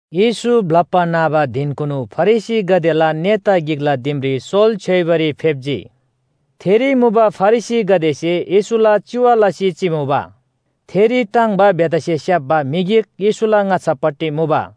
येशू ब्‍लप्‍बा न्‍हबा धिनकुनु फरिसीगदेला नेता गिकला दिमरी सोल छ्‌योइबारी फेप्‍जी। थेरी मुबा फरिसीगदेसे येशूला चिवा लसी चिमुबा। थेरी टाङ्‌बा बेथासे स्‍याप्‍बा म्‍हि गिक येशूला ङाच्‍छापट्टि मुबा।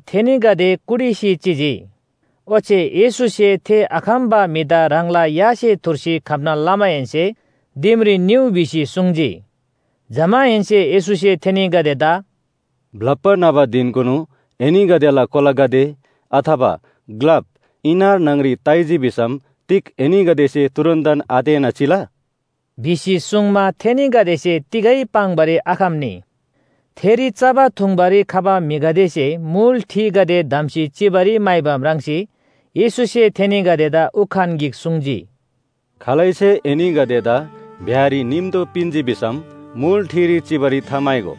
थेनीगदे कुटिसी चिजी। ओच्‍छे येशूसे थे आखम्‍बा म्‍हिदा ह्राङला यासे थुर्सी खम्‍ना लमाहेन्‍से “दिमरी निउ” भिसी सुङ्जी। जमाहेन्‍से येशूसे थेनीगदेदा “ब्‍लप्‍बा न्‍हबा धिनकुनु एनीगदेला कोलागदे अथवा ग्‍लाप इनार न्‍हङरी ताइजी भिसम तिग एनीगदेसे तुरुन्‍तन आतेःना चिला?” भिसी सुङ्मा, थेनीगदेसे तिगै पाङ्‌बारी आखम्‍नी। थेरी चबा थुङ्बारी खबा म्‍हिगदेसे मुल ठिगदे धम्‍सी चिबारी म्‍हाइबा म्राङ्सी येशूसे थेनीगदेदा उखान गिक सुङ्जी, “खालैसे एनीगदेदा ब्‍याहरी निम्‍तो पिन्‍जी भिसम मुल ठिरी चिबारी थाम्‍हाइगो।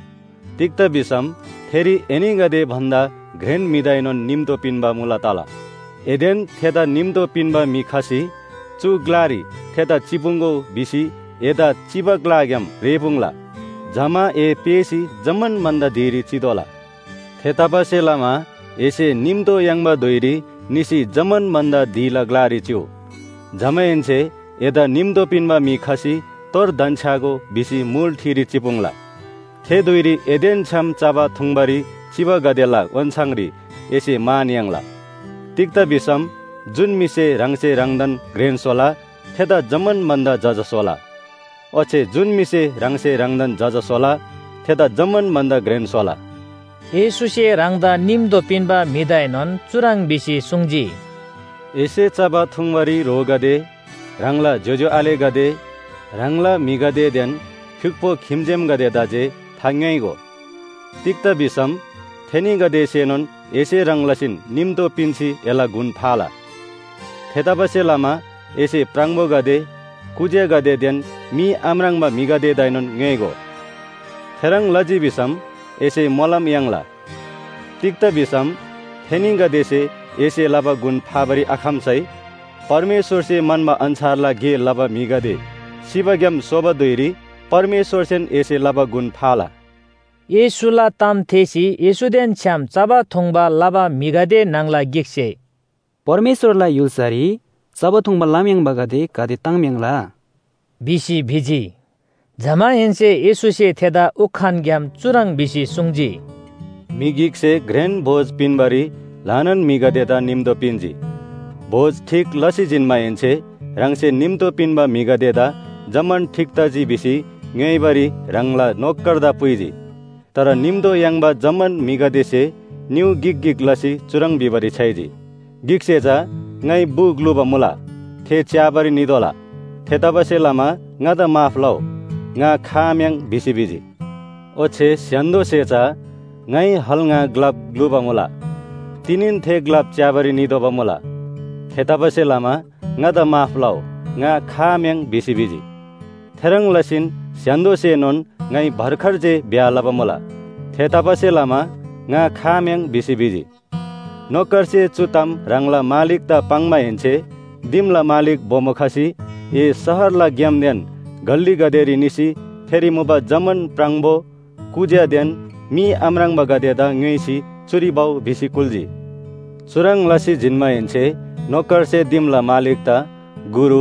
तिग्‍दा भिसम थेरी एनीगदे भन्‍दा घ्रेन म्‍हिदाएनोन निम्‍तो पिन्‍बा मुला तला। एदेन थेदा निम्‍तो पिन्‍बा म्‍हि खसी ‘चु ग्‍लारी थेदा चिपुङ्‍गो’ भिसी एदा चिबा ग्‍लाग्‍याम रेःपुङ्ला। जमा ए पेःसी जम्‍मान भन्‍दा धिरी चितोःला। थेतबासेलमा एसे निम्‍तो याङ्बा धुइरी निसी जम्‍मान भन्‍दा धिला ग्‍लारी चिउ। जमाहेन्‍से एदा निम्‍तो पिन्‍बा म्‍हि खसी ‘तोर धन्‍छ्‌यागो’ भिसी मुल ठिरी चिपुङ्ला। थे धुइरी एदेन छ्‌याम चबा थुङ्बारी चिबागदेला ओन्‍छाङरी एसे मान याङ्ला। तिग्‍दा भिसम जुन म्‍हिसे ह्राङसे ह्राङदान घ्रेन स्‍होला थेदा जम्‍मान भन्‍दा जजा स्‍होला ओच्‍छे जुन म्‍हिसे ह्राङसे ह्राङदान जजा स्‍होला थेदा जम्‍मान भन्‍दा घ्रेन स्‍होला।” येशूसे ह्राङदा निम्‍तो पिन्‍बा म्‍हिदाएनोन चुह्रङ् भिसी सुङ्जी, “एसे चबा थुङ्बारी ह्रोगदे, ह्राङला ज्‍योज्‍यो आलेगदे, ह्राङला म्‍हिगदेदेन फ्‍युक्‍पो खिम्‍जेमगदेदा जे थाङ्‌योइगो। तिग्‍दा भिसम थेनीगदेसेनोन एसे ह्रङ् लसीन निम्‍तो पिन्‍सी एला गुण फाला। थेतबासेलमा एसे प्राङबोगदे, कुज्‍यागदेदेन मी आम्राङ्बा म्‍हिगदेदाएनोन ङ्‌योइगो। थेह्रङ् लजी भिसम एसे मोलम याङ्ला। तिग्‍दा भिसम थेनीगदेसे एसे लबा गुण फाबारी आखम्‍सै परमेश्‍वरसे म्‍हन्‍बा अन्‍छारला गे लबा म्‍हिगदे सिबाग्‍याम सोबा धुइरी परमेश्‍वरसेन एसे लबा गुण फाला।” येशूला ताम थेःसी येशूदेन छ्‌याम चबा थुङ्बा लबा म्‍हिगदे न्‍हङला गिकसे “परमेश्‍वरला य्‍हुल्‍सारी चबा थुङ्बा लम्‍याङ्बागदे गाते ताङ्‍म्‍याङ्‍ला” भिसी भिजी। जमाहेन्‍से येशूसे थेदा उखानग्‍याम चुह्रङ् भिसी सुङ्जी, “म्‍हि गिकसे घ्रेन भोज पिन्‍बारी ल्‍हानान म्‍हिगदेदा निम्‍तो पिन्‍जी। भोज ठीक लसी जिन्‍माहेन्‍से ह्राङसे निम्‍तो पिन्‍बा म्‍हिगदेदा जम्‍मान ठीक तजी भिसी ङ्‌योइबारी ह्राङला नोकरदा पुइजी। तर निम्‍तो याङ्बा जम्‍मान म्‍हिगदेसे निउ गिक गिक लसी चुह्रङ् भिबारी छ्‌याइजी, ‘गिकसे चा ङाइ बु ग्‍लुबा मुला थे च्‍याबारी नितोःला। थेतबासेलमा ङादा माफ लउ, ङा खआम्‍याङ्’ भिसी भिजी। ओच्‍छे स्‍य्‍हान्‍दोसे चा ‘ङाइ हल ङा ग्‍लाप ग्‍लुबा मुला, तिनीन थे ग्‍लाप च्‍याबारी नितोःबा मुला। थेतबासेलमा ङादा माफ लउ, ङा खआम्‍याङ्’ भिसी भिजी। थेह्रङ् लसीन स्‍य्‍हान्‍दोसेनोन ‘ङाइ भर्खर जे ब्‍याह लबा मुला, थेतबासेलमा ङा खआम्‍याङ्’ भिसी भिजी। नोकरसे चु ताम ह्राङला मालिकदा पाङ्माहेन्‍से दिमला मालिक बोमो खसी ‘ए शहरला ग्‍यामदेन गल्‍लीगदेरी निसी थेरी मुबा जम्‍मान प्राङबो, कुज्‍यादेन मी आम्राङ्बागदेदा ङ्‌योइसी चुरी भउ’ भिसी कुल्‍जी। चुह्रङ् लसी जिन्‍माहेन्‍से नोकरसे दिमला मालिकदा ‘गुरु,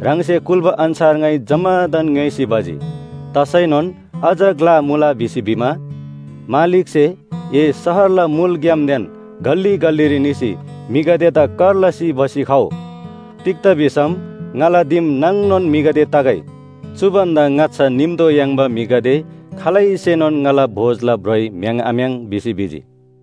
ह्राङसे कुल्‍बा अन्‍छार ङाइ जम्‍मादान ङ्‌योइसी भजी, तसैनोन अझ ग्‍ला मुला’ भिसी भिमा, मालिकसे ‘ए शहरला मुल ग्‍यामदेन गल्‍ली गल्‍लीरी निसी म्‍हिगदेदा कर लसी भसी खउ। तिग्‍दा भिसम ङाला दिम नाङनोन म्‍हिगदे तगै! चु भन्‍दा ङाच्‍छा निम्‍तो याङ्बा म्‍हिगदे खालैसेनोन ङाला भोजला ब्रोइ म्‍य्‍हाङ् आम्‍य्‍हाङ्’ भिसी भिजी।”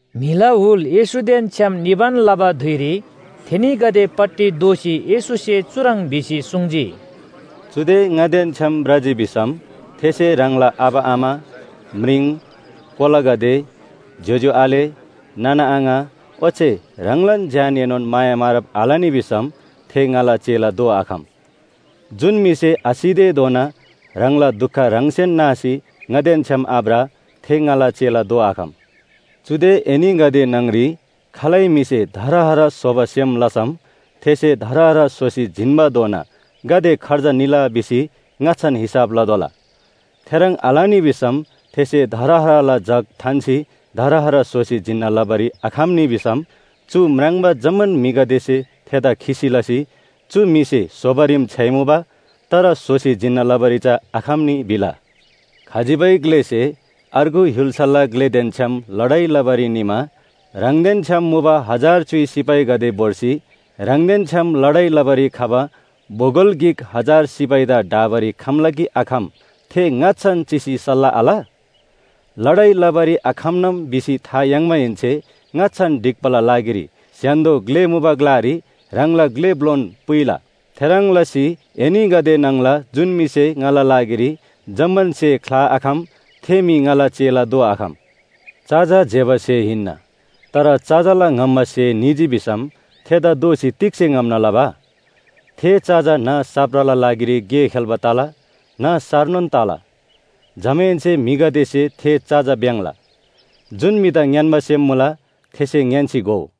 म्‍हिला हुल येशूदेन छ्‌याम निबान लबा धुइरी थेनीगदेपट्टि दोःसी येशूसे चुह्रङ् भिसी सुङ्जी, “चुदे ङादेन छ्‌याम भ्रजी भिसम थेसे ह्राङला आबा आमा, म्रिङ, कोलागदे, ज्‍योज्‍यो आले, नाना आङा ओच्‍छे ह्राङलान ज्‍यानएनोन माया मारब आलनी भिसम थे ङाला चेला दोआखम। जुन म्‍हिसे आसितेधोना ह्राङला दुख ह्राङसेन नासी ङादेन छ्‌याम आभ्र थे ङाला चेला दोआखम। “चुदे एनीगदे न्‍हङरी खालै म्‍हिसे धरहरा स्‍होबा सेम लसम थेसे धरहरा स्‍होसी जिन्‍बाधोना गाते खर्च निला भिसी ङाच्‍छान हिसाब लतोःला। थेह्रङ् आलनी भिसम थेसे धरहराला जग थान्‍सी धरहरा स्‍होसी जिन्‍ना लबारी आखम्‍नी भिसम चु म्राङ्बा जम्‍मान म्‍हिगदेसे थेदा खिसी लसी, ‘चु म्‍हिसे स्‍होबारीम छ्‌याइमुबा तर स्‍होसी जिन्‍ना लबारी चा आखम्‍नी’ भिला। “खजिबै ग्‍लेसे अर्गु य्‍हुल्‍साला ग्‍लेदेन छ्‌याम लडाइ लबारी निमा ह्राङदेन छ्‌याम मुबा हजार च्‍युइ सिपाहीगदे भोर्सी ह्राङदेन छ्‌याम लडाइ लबारी खबा बोगल गिक हजार सिपाहीदा ढाबारी खम्‍ला कि आखम थे ङाच्‍छान चिसी सल्‍लाह आल? लडाइ लबारी आखम्‍नाम भिसी था याङ्माहेन्‍से ङाच्‍छान ढिक्‍बाला लागिरी स्‍य्‍हान्‍दो ग्‍ले मुबा ग्‍लारी ह्राङला ग्‍ले ब्‍लोन पुइला। थेह्रङ् लसी एनीगदे न्‍हङला जुन म्‍हिसे ङाला लागिरी जम्‍मान स्‍हे ख्‍लाआखम थे म्‍हि ङाला चेला दोआखम। “चजा ज्‍यबा स्‍हे हिन्‍ना, तर चजाला ङम्‍बा स्‍हे निजी भिसम थेदा दोःसी तिग्‍से ङम्‍ना लबा? थे चजा न्‍ह साप्राला लागिरी गे खेल्‍बा तला न्‍ह सारनोन तला। जमाहेन्‍से म्‍हिगदेसे थे चजा भ्‍याङ्‍ला। जुन म्‍हिदा ङ्‌यान्‍बा सेम मुला थेसे ङ्‌यान्‍सी घोउ।”